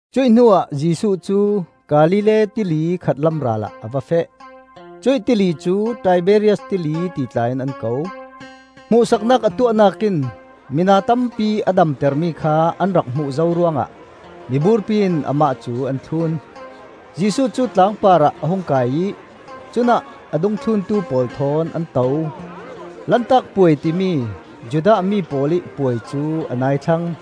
Cuih hnuah Jesuh cu Galilee Tili khatlam ral ah a va feh. Cuih Tili cu Tiberias Tili ti tla in an ko. Hmuhsaknak a tuahnak in mina tampi a damtermi kha an rak hmuh zo ruangah miburpi in amah cu an thlun. Jesuh cu tlangpar ah a hung kai ih cunah a dungthluntu pawl thawn an to. Lantak Puai timi Judah mi pawl ih puai cu a nai thlang.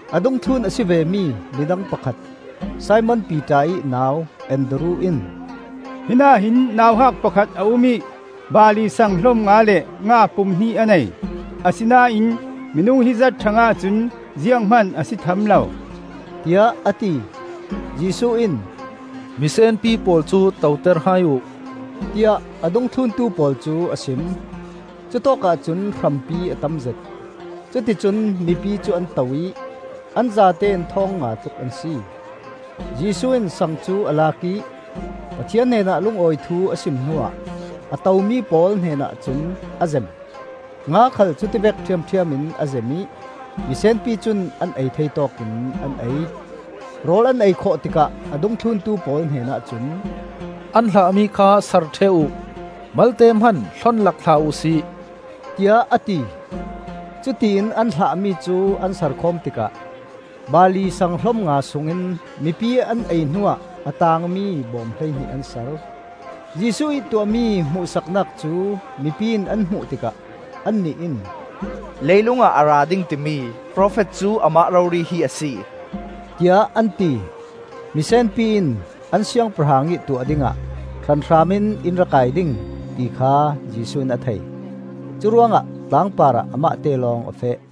A dungthlun a si vemi midang pakhat, Simon Piter ih nau Andru in, “Hinah hin nauhak pakhat a um ih barli saang hlom nga le nga pum hnih a nei. Asinain minung hizat hrangah cun zianghman a si tham lo,” tiah a ti. Jesuh in, “Mi senpi pawl cu toter hai uh,” tiah a dungthluntu pawl cu a sim. Cutawkah cun hrampi a tamzet. Cuti cun mipi cu an to ih an zatein thawng nga tluk an si. Jesuh in sang cu a lak ih Pathian hnenah lungawi thu a sim hnuah a tomi pawl hnenah cun a zem. Nga khal cutivek ṭhiamṭhiam in a zem ih misenpi cun an ei thei tawkin an ei. Rawl an ei khawh tikah a dungthluntu pawl hnenah cun, “An hlahmi kha sar ṭheh uh; malte hman hlon lak hlah uhsi,” tiah a ti. Cutiin an hlahmi cu an sar khawm tikah barli sang hlom nga sungin mipi ih an ei hnuah a taangmi bawm hleihnih an sar. Jesuh ih tuahmi hmuhsaknak cu mipi in an hmuh tikah annih in, “Leilung ah a ra ding, timi profet cu amah rori hi a si,” tiah an ti. Misenpi in an siangpahrang ih tuah dingah hranhram in in ra kai ding, ti kha Jesuh in a thei; curuangah tlangpar ah amahte lawng a feh.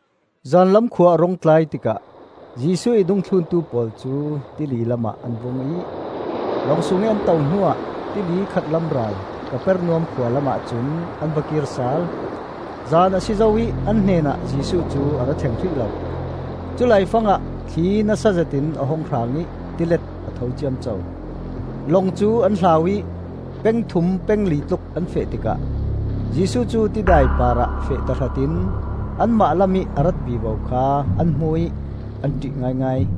Zanlam khua a rung tlai tikah Jesuh ih dungthluntu pawl cu tili lamah an vung ih, lawng sungih an to hnuah tili khatlam ral, Kapernaum khualam ahcun an va kir sal. Zan a si zo ih an hnenah Jesuh cu a ra thleng hrih lo. Culai fangah thli nasa zetin a hung hrang ih tilet a tho ciamco. Long cu an hlau ih peng thum peng li tluk an feh tikah Jesuh cu tidai parah feh tahratin anmah lamih a rat vivo kha an hmu ih an ṭih ngaingai.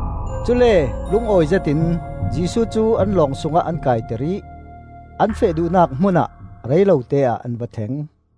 Cule lungawi zetin Jesuh cu an lawng sungah an kaiter ih an feh duhnak hmun ah reilote-ah an va thleng.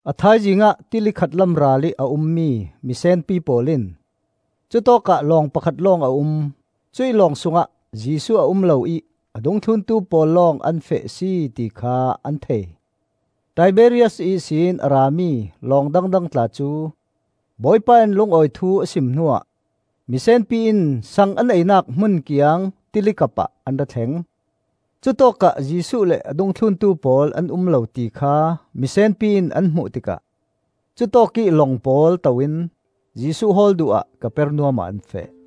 A thaizing ah tili khatlam ralih a ummi misenpi pawl in cutawkah lawng pakhat lawng a um, cuih lawng sungah Jesuh a um lo ih a dungthluntu pawl lawng an feh a si, ti kha an thei. Tiberias ihsin a rami lawng dangdang tla cu Bawipa in lungawi thu a sim hnuah misenpi in saang an einak hmun kiang tili kapah an ra thleng. Cutawkah Jesuh le a dungthluntu pawl an um lo tikha misenpi in an hmuh tikah cutawkih lawng pawl to in Jesuh hawl duh ah Kapernaum ah an feh.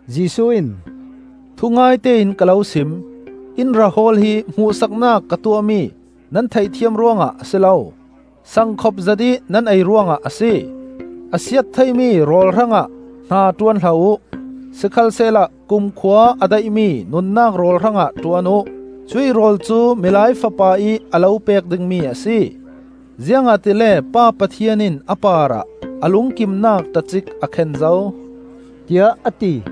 Jesuh in, “Thungaite in ka lo sim: in ra hawl hi hmuhsaknak ka tuahmi nan theihthiam ruangah a si lo, sang khop zetih nan ei ruangah a si. A siat theimi rawl hrangah hna ṭuan hlah uh; sikhalsehla kumkhua a daihmi nunnak rawl hrangah ṭuan uh. Cuih rawl cu Milai Fapa ih a lo pek dingmi a si, ziangahtile Pa Pathian in a parah a lungkimnak tacik a khen zo,” tiah a ti.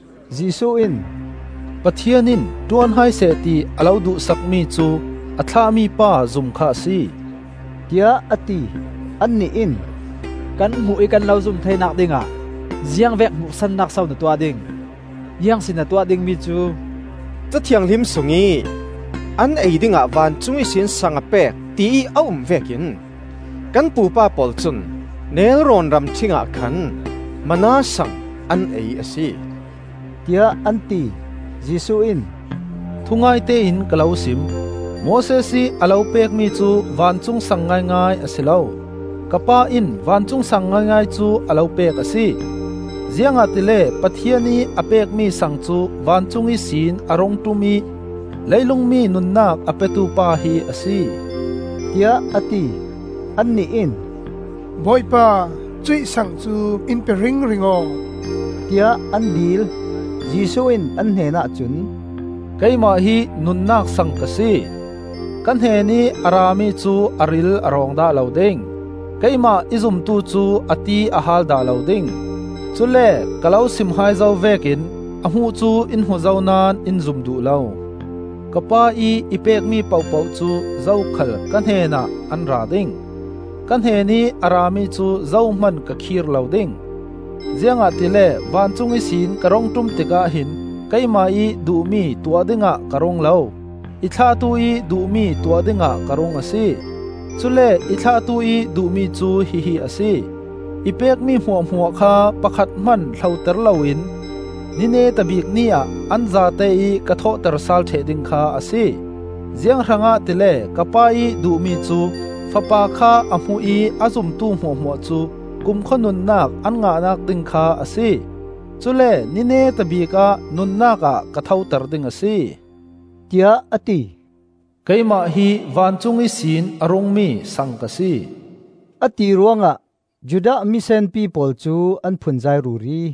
Jesuh in, “Pathian in ṭuan hai seh ti a lo duh sakmi cu a thlahmi pa zum kha a si,” tiah a ti. Annih in, “Kan hmuh ih kan lo zum theinak dingah ziangvek hmuhsaknak so na tuah ding? Ziang si na tuah dingmi cu? Ca Thianghlim sungih ‘An ei dingah vancung ihsin sang a pek,’ tiih a um vekin kan pupa pawl cun nelrawn ramṭhing ah khan manna sang an ei a si,” tiah an ti. Jesuh in, “Thungaite in ka lo sim: Moses ih a lo pekmi cu vancung saang ngaingai a si lo. Ka Pa in vancung saang ngaingai cu a lo pek a si. Ziangahtile Pathian ih a pekmi saang cu vancung ihsin a rungṭum ih leilung mi nunnak a petu pa hi a si,” tiah a ti. Annih in, “Bawipa, cuih saang cu in pe ringring aw,” tiah an dil. Jesuh in an hnenah cun, “Keimah hi nunnak sang ka si. Ka hnenih a rami cu a ril a rawng dah lo ding; keimah i zumtu cu a ti a haal dah lo ding. Cule ka lo sim hai zo vekin a hmuh cu in hmu zo naón in zum duh lo. Ka Pa ih i pekmi pohpoh cu zokhal ka hnen ah an ra ding. Ka hnenih a rami cu zohman ka khir lo ding, ziangahtile vancung ihsin ka rung ṭum tikah hin keimah ih duhmi tuah dingah ka rung lo, i thlahtu ih duhmi tuah dingah ka rung a si. Cule i thlahtu ih duhmi cu hihi a si: I pekmi hmuahhmuah kha pakhat hman hloter loin, ni neta bik ni-ah an zate ih ka thawhter sal ṭheh ding kha a si. Ziang hrangah tile ka Pa ih duhmi cu Fapa kha a hmu ih a zumtu hmuahhmuah cu kumkhua nunnak an ngahnak ding kha a si. Cule ni neta bikah nunnak ah ka thoter ding a si,” tiah a ti. “Keimah hi vancung ihsin a rungmi saang ka si,” a ti ruangah Judah mi senpi pawl cu an phunzai ruri.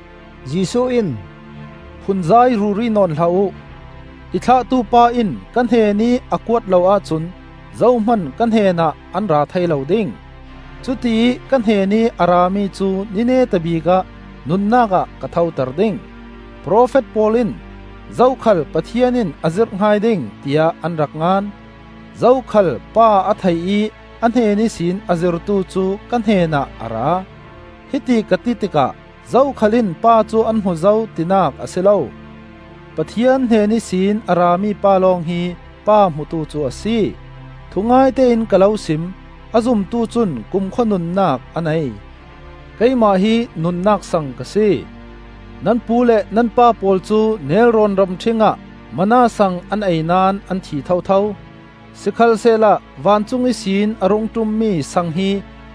Jesuh in, “Phunzai ruri nawn hlah uh! I thlahtupa in ka hnenih a kuat lo ahcun zohman ka hnenah an ra thei lo ding; cutiih ka hnenih a rami cu ni neta bikah nunnak ah ka thoter ding. Profet pawl in, ‘Zokhal Pathian in a zirh hai ding,’ tiah an rak ngan. Zokhal Pa a thei ih a hnen ihsin a zirtu cu ka hnenah a ra. Hiti ka ti tikah zokhal in Pa cu an hmu zo, tinak a si lo; Pathian hnen ihsin a ra mipa lawng hi Pa hmutu cu a si. Thungaite in ka lo sim: a zumtu cun kumkhua nunnak a nei. Keimah hi nunnak saang ka si. Nan pu le nan pa pawl cu nelrawn ramṭhing ah manna saang an ei naón an thi thotho. Sikhalsehla vancung ihsin a rung ṭummi saang hi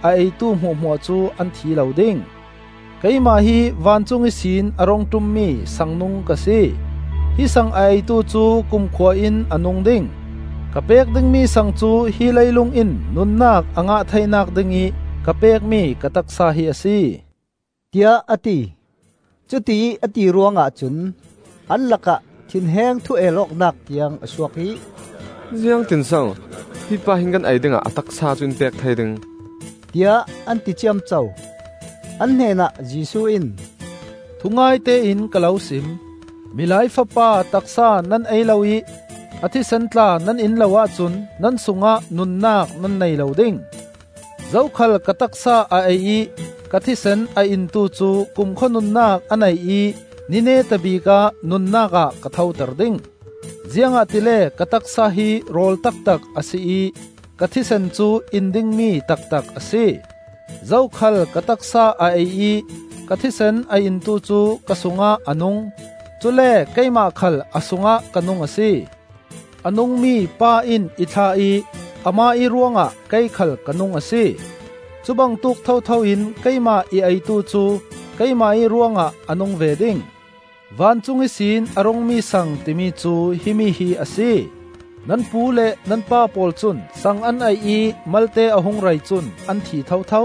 a eitu hmuahhmuah cu an thi lo ding. Keimah hi vancung ihsin a rung ṭummi saang nung ka si. Hi saang a eitu cu kumkhua in a nung ding. Ka pek dingmi saang cu hi leilung in nunnak a ngah theinak dingih ka pekmi ka taksa hi a si,” tiah a ti. Cutiih a ti ruangah cun an lakah thinheng thu-el awknak tiang a suak ih, “Ziangtin so hi pa hin kan ei dingah a taksa cu in pek thei ding?” tiah an ti ciamco. An hnenah Jesuh in, “Thungaite in ka lo sim: Milai Fapa taksa nan ei lo ih a thisen tla nan in lo ahcun nan sungah nunnak nan nei lo ding. Zokhal ka taksa a ei ih ka thisen a intu cu kumkhua nunnak a nei ih ni neta bikah nunnak ah ka thoter ding. Ziangahtile ka taksa hi rawl taktak a si ih ka thisen cu in dingmi taktak a si. Zokhal ka taksa a ei ih ka thisen a intu cu ka sungah a nung; cule keimah khal a sungah ka nung a si. A nungmi Pa in i thlah ih amah ih ruangah kei khal ka nung a si. Cubangtuk thotho in keimah i eitu cu keimah ih ruangah a nung ve ding. Vancung ihsin a rungmi saang timi cu himi hi a si; nan pu le nan pa pawl cun saang an ei ih malte a hung rei cun an thi thotho;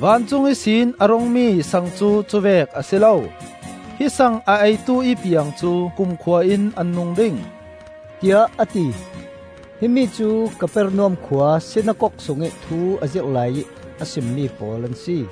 vancung ihsin a rungmi saang cu cuvek a si lo. Hi saang a eitu ih piang cu kumkhua in an nung ding,” tiah a ti. Himi cu Kapernaum khua sinakok sungih thu a zirh laiih a simmi pawl an si.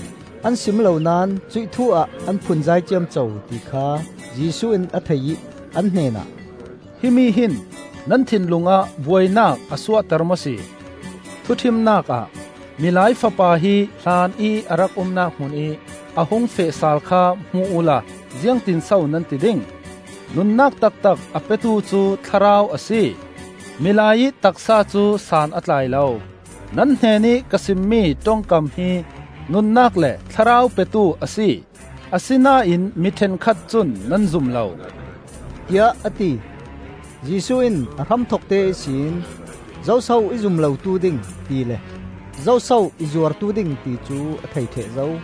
An sim lo naón cuih thu-ah an phunzai ciamco ti kha Jesuh in a thei ih an hnenah, “Himi hin nan thinlung ah buainak a suahter maw si? Thuṭhimnak ah Milai Fapa hi hlanih a rak umnak hmunih a hung feh sal kha hmu uhla ziangtinso nan ti ding? Nunnak taktak a petu cu Thlarau a si; milai-ih taksa cu san a tlai lo. Nan hnenih ka simmi ṭongkam hi nunnak le Thlarau petu a si. Asinain mi ṭhenkhat cun nan zum lo,” tiah a ti. Jesuh in a hramthokte ihsin zoso i zum lotu ding, tile zoso i zuartu ding ticu a thei ṭheh zo.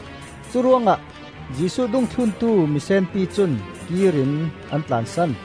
Curuangah Jesuh dungthluntu misenpi cun kir in an tlansan.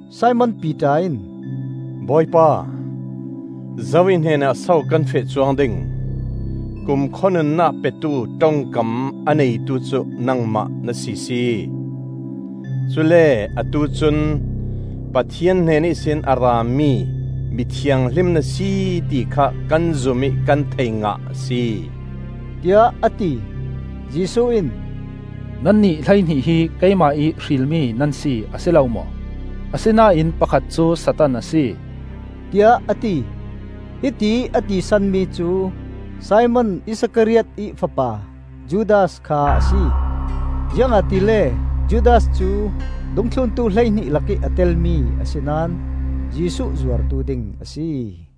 Simon Piter in, “Bawipa, zo ih hnenah so kan feh cuang ding? Kumkhua nunnak petu ṭongkam a neitu cu nangmah na sisi! Cule atu cun Pathian hnen ihsin a rami Mi Thianghlim na si ti kha kan zum ih kan thei ngah a si,” tiah a ti. Jesuh in, “Nannih hleihnih hi keimah ih hrilmi nan si, a si lo maw? Asinain pakhat cu satan a si,” tiah a ti. Hitiih a ti sanmi cu Simon Iskariot ih fapa Judas kha a si. Ziangahtile Judas cu dungthluntu hleihnih lakih a telmi a si naón Jesuh zuartu ding a si.